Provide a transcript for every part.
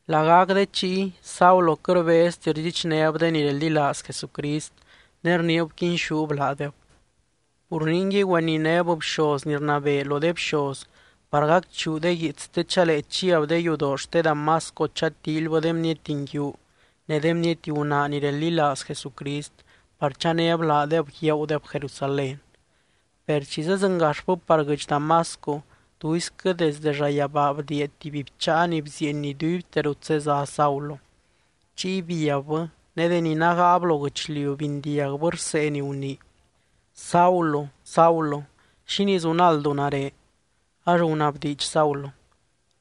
Lagac de chiy, Saulo quɨt rbezti rdxichnéb de ni reldilaaz Jesucrist, ne rniib quinxúb laadeb. Pur ningui, güeninéb bxoz ni rnabee lo de bxoz par gacchuu de guiits, te chalee chiab de yudoo xte Damasco chatíilybɨ de bniety nguiu ne de bniety gunaa ni reldilaaz Jesucrist par chanéb laadeb guiaagudeb Jerusalén. Per chi zedzɨngaxbɨ par guɨdx Damasco, tuisquɨ desde llayabaa bdiia tuby bcháa ni bzieeny iduibte rut zezá Saulo. Chiy biabbɨ, ne deni nágaab lo guɨchliu bindiagbɨ rsee ni gunii: —Saulo, Saulo, ¿xínii zunaldu nare? Ax gunabdiidx Saulo: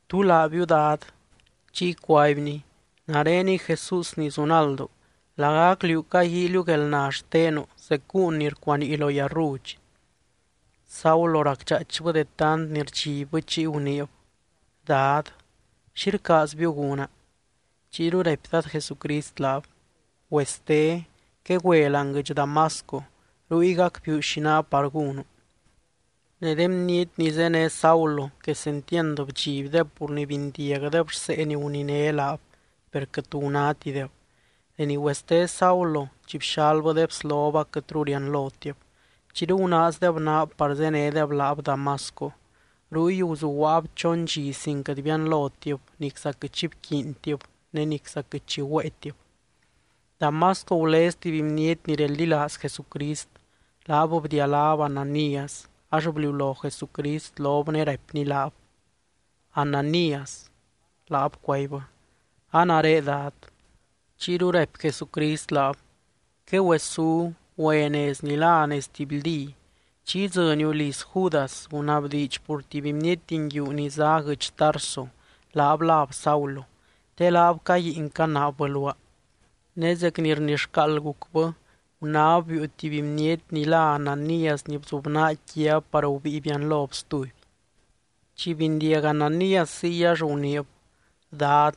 —¿Tú laabiu, Dad? Chiy cuaibny: —Nareniy Jesús ni zunaldu. Lagac liú caguíiliu guelna xtenu zec gúun ni rcuanii lo yarrudx. Saulo racdxaaichbɨ de tant ni rdxibbɨ, chiy guniib: —Dad, ¿xi rcaazbiu gúna? Chiyru raipy Dad Jesucrist laab: —Güeste. Quegüe láani guɨdx Damasco. Ruy gacbiiu xi ná par gúnu. Ne de bniety ni zéne Saulo, quesentiand bdxibdeb pur ni bindiagdeb rsee ni guniné laab, per quɨt tu gunátideb. Deni güeste Saulo, chi bxalbɨ de bslob, aquɨtru rianlotib. Chiyru gunaazdeb naab par zénedeb laab Damasco. Ruy guzuguaab chon dxi sin quɨt bianlotib, nicza quɨt xi bquiintib ne nicza quɨt xi güéetib. Damasco gulez tuby bniety ni reldilaaz Jesucrist. Laab bdialáb Ananías, ax bliulo Jesucrist lob ne raipny laab: —¡Ananías! Laab cuaibbɨ: —A nare, Dad. Chiyru raipy Jesucrist laab: —Quegüesú, güe nez ni lá Nez Tibyldí. Chi idzɨniu liz Judas, gunabdiidx pur tuby bniety nguiu ni zá guɨdx Tarso, laab láb Saulo. Te laab caguiin canaabbɨ luaa. Ne zec ni rnixcaald gucbɨ, gunáb biiu tuby bniety ni lá Ananías ni bzubnaa quiab par gubíi bianlob stuby. Chi bindiag Ananías ziy ax guniib: —Dad,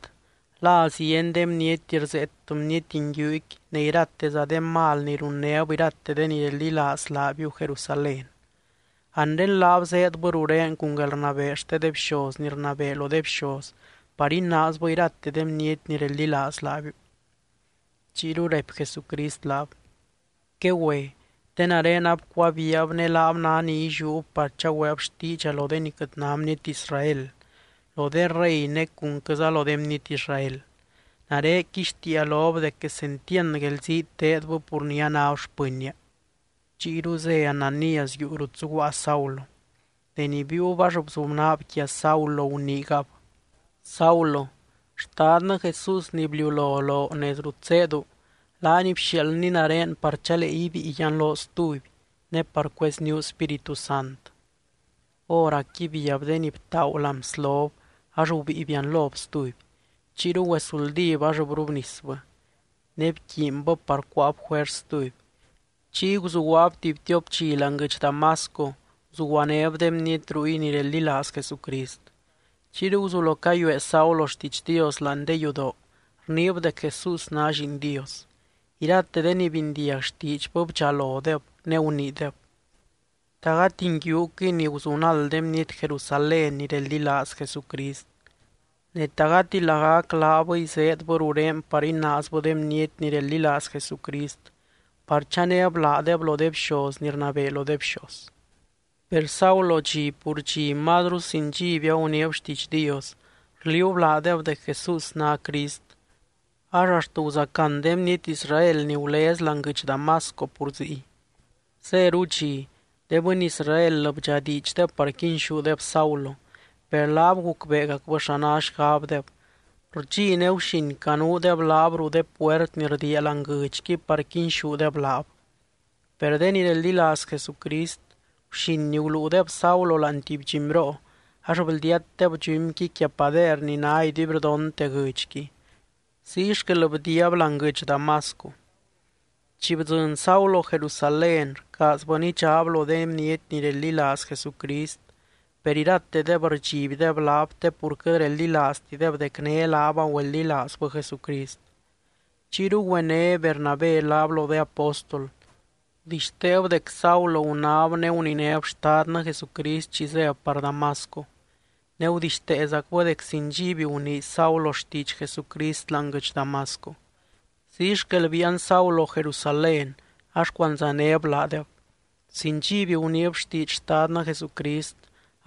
la zieny de bniety rzeet bniety nguiuqui ne irateza de mal ni runnéb irate de ni reldilaaz laabiu Jerusalén. Anre laab zéedbɨ rurén cun guelrnabee xte de bxoz ni rnabee lo de bxoz par inaazbɨ irate de bniety ni reldilaaz laabiu. Chiyru raipy Jesucrist laab: —Quegüe, te nare abcuabiiab ne laab ná ni illiúb par chagüeeb xtiidxa lo de ni quɨt ná bniety Israel, lo de rey ne cunquɨza lo de bniety Israel. Nare quixtiia lob dec quesentiand guelzii teedbɨ pur ni anáb xpɨnnia. Chiyru zé Ananías yuu rut zuguaa Saulo. Deni biiub ax bzubnaab quia Saulo guniigab: —Saulo. Xtadnɨ Jesús ni bliulo loo nez rut zéedu, laany bxiaaldny nare par chalee ibíi yianloo stuby, ne par cuezníu Spíritu Sant. Hóracqui biab de ni btaagu láani bslob, ax gubíi bianlob stuby. Chiyru güezuldíb ax brubnisbɨ. Ne bquiinbɨ par cuáab juers stuby. Chiy guzuguaab tuby tiop dxi láani guɨdx Damasco, guzuguanéb de bniety ruy ni reldilaaz Jesucrist. Chiyru guzulo cayuee Saulo xtiidx Dios láani de yudoo, rniib dec Jesús ná Lliin Dios. Irate de ni bindiag xtiidxbɨ bdxalodeb, ne guniideb: —¿Ta gati nguiuquɨy ni guzunald de bniety Jerusalén ni reldilaaz Jesucrist? Ne, ¿ta gati lagac laabɨy zéedbɨ rurén par inaazbɨ de bniety ni reldilaaz Jesucrist, par chanéb laadeb lo de bxoz ni rnabee lo de bxoz? Per Saulo dxi pur dxi mazru sin dxiby aguniib xtiidx Dios, rliuub laadeb dec Jesús ná Crist. Ax axt guzacán de bniety Israel ni gulez láani guɨdx Damasco pur ziy. Zéru dxi, de bɨny Israel bdxadiidxdeb par quinxúdeb Saulo, per laab gucbeegacbɨ xa ná xgabdeb. Rdxi ne guxin canuudeb laab ruu de puert ni rdiia láani guɨdxqui par quinxúdeb laab. Per de ni reldilaaz Jesucrist, guxin guluudeb Saulo láani tuby dxumyroo ax bldiatdeb dxumyqui quia pader ni ná iduibrdonte guɨdxqui. Ziy xquel bdiiab láani guɨdx Damasco. Chi bdzɨny Saulo Jerusalén, rcaazbɨ nidxaab lo de bniety ni reldilaaz Jesucrist. Per iratedeb rdxibdeb laab te pur quɨt reldilaaztideb dec né laab agüeldilaazbɨ Jesucrist. Chiyru güené Bernabé laab lo de apóstol. Gudixteeb dec Saulo gunáb ne guninéb Xtadnɨ Jesucrist chi zéb par Damasco, ne gudixteezacbɨ dec sin dxiby gunii Saulo xtiidx Jesucrist láani guɨdx Damasco. Ziy xquel biian Saulo Jerusalén, ax cuandzanéb laadeb. Sin dxiby guniib xtiidx Xtadnɨ Jesucrist,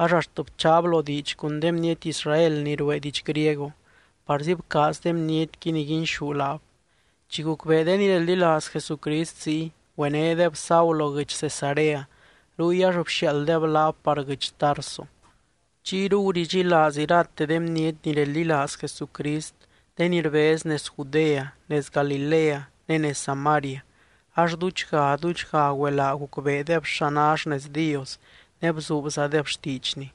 ax axt bchaab lo diidx cun de bniety Israel ni ruee diidx griego, parzi bcaaz de bnietqui niguinxú laab. Chi gucbee de ni reldilaaz Jesucrist ziy, güenédeb Saulo guɨdx Cesarea. Ruy ax bxiaalddeb laab par guɨdx Tarso. Chiyru guridxilaaz irate de bniety ni reldilaaz Jesucrist de ni rbez nez Judea, nez Galilea ne nez Samaria, ax duudxga, duudxga güelaa gucbeedeb xa ná xnez Dios ne bzuubzadeb xtiidxny.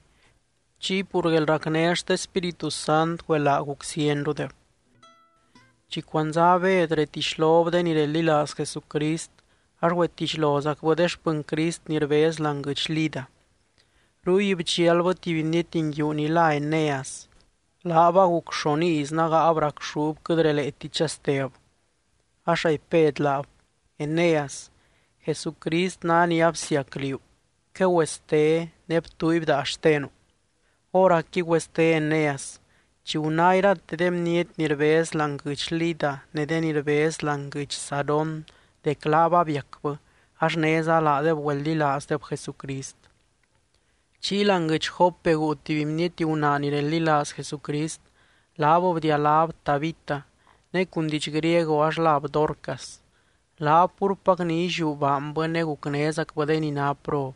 Chiy pur guelracné xte Spíritu Sant güelaa guc zienrudeb. Chi cuandzá Bed retixlob de ni reldilaaz Jesucrist, ax güetixlozacbɨ de xpɨny Crist ni rbez láani guɨdx Lida. Ruy bdxialbɨ tuby bniety nguiu ni lá Eneas. Laab aguc xon iz nágaab racxúb quɨt releeti chasteb. Ax raipy Bed laab: —Eneas, Jesucrist ná ni absiac liú. Quegüeste, ne btuuiby daa xtenu. Hóracqui güeste Eneas. Chi guná irate de bniety ni rbez láani guɨdx Lida ne de ni rbez láani guɨdx Sarón dec laab abiacbɨ, ax néza laadeb güeldilaazdeb Jesucrist. Chiy láani guɨdx Jope guu tuby bniety gunaa ni reldilaaz Jesucrist. Laab bdialáb Tabita, ne cun diidx griego ax láb Dorcas. Laab púrpac ni illiú baanbɨ ne gucnézacbɨ de ni ná prob.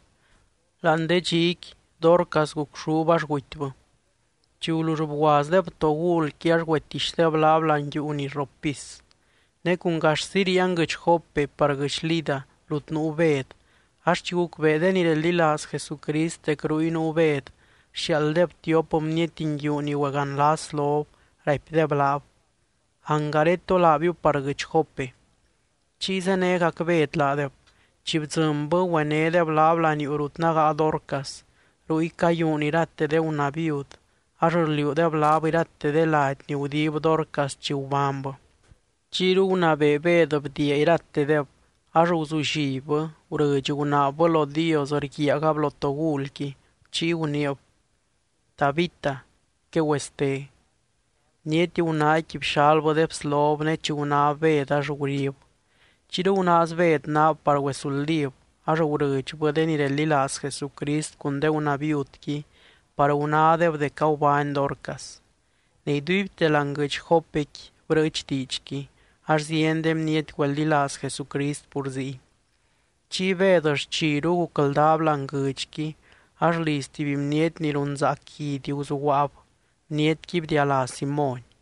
Láani de dxiqui, Dorcas gucxúb ax gutybɨ. Chi gulull bguazdeb togulqui ax güetixdeb laab láani yuu ni rrop pis. Ne cun gaxzi ríian guɨdx Jope par guɨdx Lida rut nuu Bed ax chi gucbee de ni reldilaaz Jesucrist dec ruy nuu Bed, bxiaalddeb tiop bniety nguiu ni güeganlas lob, raipdeb laab: —Angaré tolaabiu par guɨdx Jope. Chiy zénegac Bed laadeb. Chi bdzɨnbɨ, güenédeb laab laniuu rut nágaa Dorcas. Ruy cayuun irate de gunaa viud, ax rliuudeb laab irate de lady ni gudib Dorcas chi gubánybɨ. Chiyru gunabee Bed bdiia iratedeb ax guzullibbɨ, gurɨdx gunaabbɨ lo Dios rguiaagab lo togulqui, chiy guniib: —Tabita, quegüeste. Bniety gunaaqui bxalbɨ de bslob ne chi gunáb Bed ax gurib. Chiyru gunaaz Bed naab par güezuldíb, ax gurɨdxbɨ de ni reldilaaz Jesucrist cun de gunaa viudqui par gunádeb dec agubány Dorcas. Ne iduibte láani guɨdx Jopequi brɨɨch diidxqui, ax zieny de bniety güeldilaaz Jesucrist pur ziy. Chiy Bed xchiru gucldaab láani guɨdxqui ax liz tuby bniety ni runzaac guidy guzuguaab. Bnietqui bdialá Simóny.